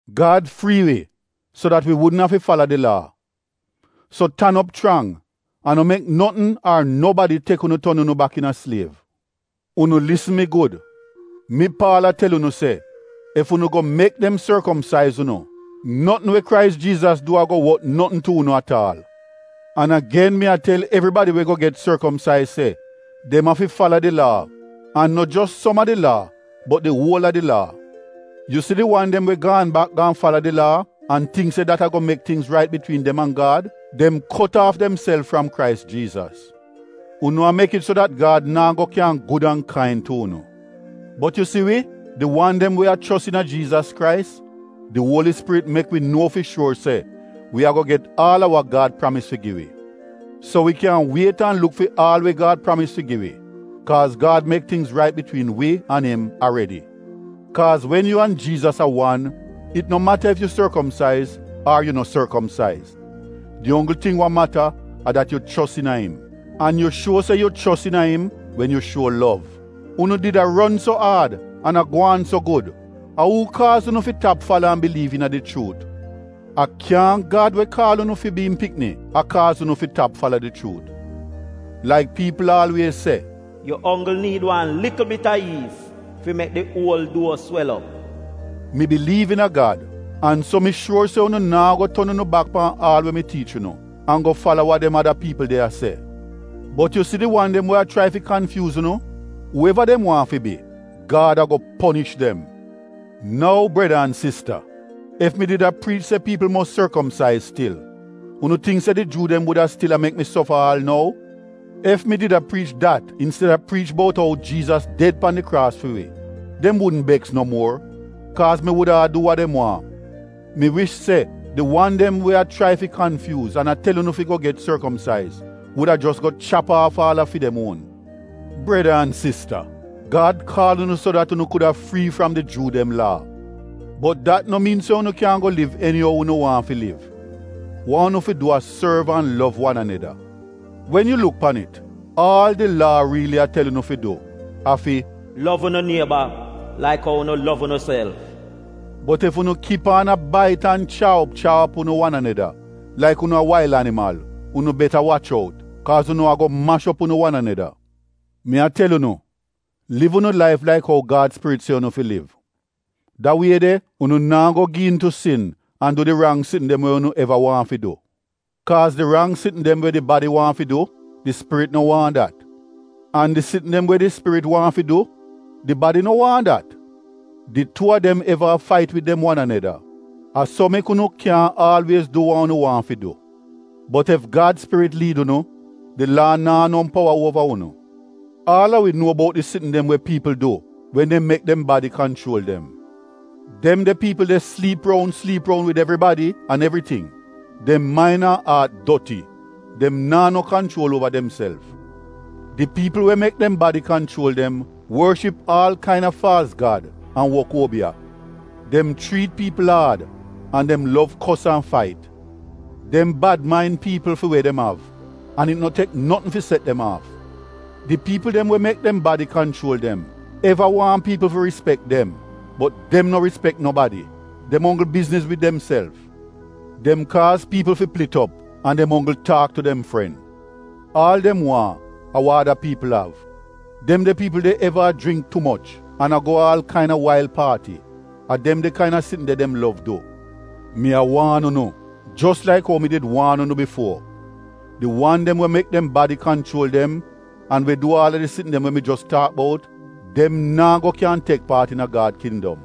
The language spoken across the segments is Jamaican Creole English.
Gad frii wi so dat wi wudn afi fala di Laa. So tan op chrang an no mek notn ar nobadi tek unu ton unu bak iina sliev. Unu lisn mi gud! Mi, Paal, a tel unu se ef unu go mek dem sorkomsaiz unu, notn we Krais Jiizas du ago wot notn tu unu at aal. An agen mi a tel evribadi we go get sorkomsaiz se dem afi fala di Laa. An no jos som a di Laa bot di uol a di Laa. Yu si di wan dem we gaan bak gaan fala di Laa an tingk se dat ago mek tingz rait bitwiin dem an Gad — dem kot aaf demself fram Krais Jiizas. Unu a mek it so dat Gad naa go kyan gud an kain tu unu. Bot yu si wi, di wan dem we a chos iina Jiizas Krais, di Uoli Spirit mek wi nuo fi shuor se wi ago get aal a wa Gad pramis fi gi wi. So wi kyan wiet an luk fi aal we Gad pramis fi gi wi kaaz Gad mek tingz rait bitwiin wi an im aredi. Kaaz wen yu an Jiizas a wan it no mata ef yu sorkomsaiz ar yu no sorkomsaiz. Di onggl ting wa mata a dat yu chos iina im. An yu shuo se yu chos iina im wen yu shuo lov. Unu did a ron so aad an a gwaan so gud! A uu kaaz unu fi tap fala an biliiv iina di chuut? A kyaahn Gad we kaal unu fi bi im pikni, a kaaz unu fi tap fala di chuut. Laik piipl aalwiez se, “Yu onggl niid wan likl bit a yiis fi mek di uol duo swel op.” Mi biliiv iina Gad, an so mi shuor se unu naa go ton unu bak pan aal we mi tiich unu an go fala wa dem ada piipl de a se. Bot yu si di wan dem we a chrai fi kanfyuuz unu, uu eva dem waahn fi bi, Gad ago ponish dem. Nou breda an sista, ef mi did a priich se piipl mos sorkomsaiz stil, unu tingk se di Juu dem wuda stil a mek mi sofa aal nou? Ef mi did a priich dat insteda priich bout ou Jiizas ded pan di kraas fi wi, dem wudn beks no muor, kaaz mi wuda a du dem waahn. Mi wish se di wan dem we a chrai fi kanfyuuz an a tel unu fi go get sorkomsaiz wuda jos go chap aaf aal a fi dem uon. Breda an sista, Gad kaal unu so dat unu kuda frii fram di Juu dem Laa. Bot dat no miin se unu kyan go liv eni ou unu waahn fi liv. Wa unu fi du a sorv an lov wan aneda. Wen yu luk pan it, aal di Laa riili a tel unu fi du a fi “Lov unu nieba laik ou unu lov unuself.” Bot ef unu kip aan a bait an chaa op chaa op unu wan aneda laik unu a wail animal, unu beta wach out, kaaz unu ago mash op unu wan aneda. Mi a tel unu liv unu laif laik ou Gad Spirit se unu fi liv. Da wie de unu naa go gi iin tu sin an du di rang sitn dem we unu eva waahn fi du. Kaaz di rang sitn dem we di badi waahn fi du, di Spirit no waahn dat. An di sitn dem we di Spirit waahn fi du, di badi no waahn dat. Di tuu a dem eva a fait wid dem wan aneda, a so mek unu kyaahn aalwiez du wa unu waahn fi du. Bot ef Gad Spirit liid unu, di Laa naa no powa uova unu. Aal a wi nuo bout di sitn dem we piipl du wen dem mek dem badi kanchuol dem. Dem de piipl de sliip roun sliip roun wid evribadi an evriting. Dem main an aat doti. Dem naa no kanchuol uova demself. Di piipl we mek dem badi kanchuol dem worship aal kaina faalz gad an wok uobiya. Dem chriit piipl aad an dem lov kos an fait. Dem bad main piipl fi we dem av an it no tek notn fi set dem aaf. Di piipl dem we mek dem badi kanchuol dem eva waahn piipl fi rispek dem bot dem no rispek nobadi. Dem onggl bizniz wid demself. Dem kaaz piipl fi plit op an dem onggl taak tu dem fren. Aal dem waahn, a wa ada piipl av. Dem de piipl de eva a jringk tu moch, an a go aal kaina wail paati. A dem de kaina sitn de dem lov du. Mi a waan unu jos laik ou mi did waan unu bifuo: di wan dem we mek dem badi kanchuol dem an we du aal a di sitn dem we mi jos taak bout — dem naa go kyan tek paat iina Gad kindom.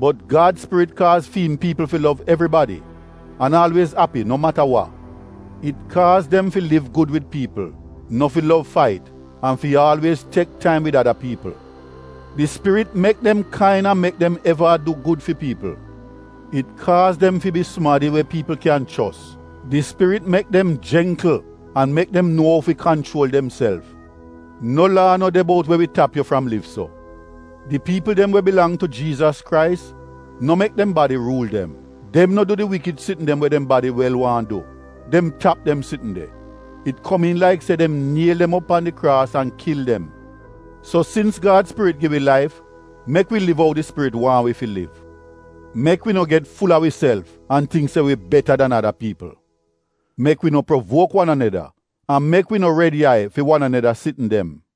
Bot Gad Spirit kaaz fi im piipl fi lov evribadi an aalwiez api no mata wa. It kaaz dem fi liv gud wid piipl, no fi lov fait an fi aalwiez tek taim wid ada piipl. Di Spirit mek dem kain an mek dem eva a du gud fi piipl. It kaaz dem fi bi sumadi we piipl kyan chos. Di Spirit mek dem jengkl an mek dem nuo ou fi kanchuol demself. No Laa no de bout we wi tap yu fram liv so. Di piipl dem we bilang tu Jiizas Krais no mek dem badi ruul dem. Dem no du di wikid sitn dem we dem badi wel waahn du, dem tap dem sitn de. It komiin laik se dem niel dem op pan di kraas an kil dem. So sins Gad Spirit gi wi laif, mek wi liv ou di Spirit waahn wi fi liv. Mek wi no get ful-a wiself an tingk se wi beta dan ada piipl. Mek wi no provuok wan aneda an mek wi no red yai fi wan aneda sitn dem.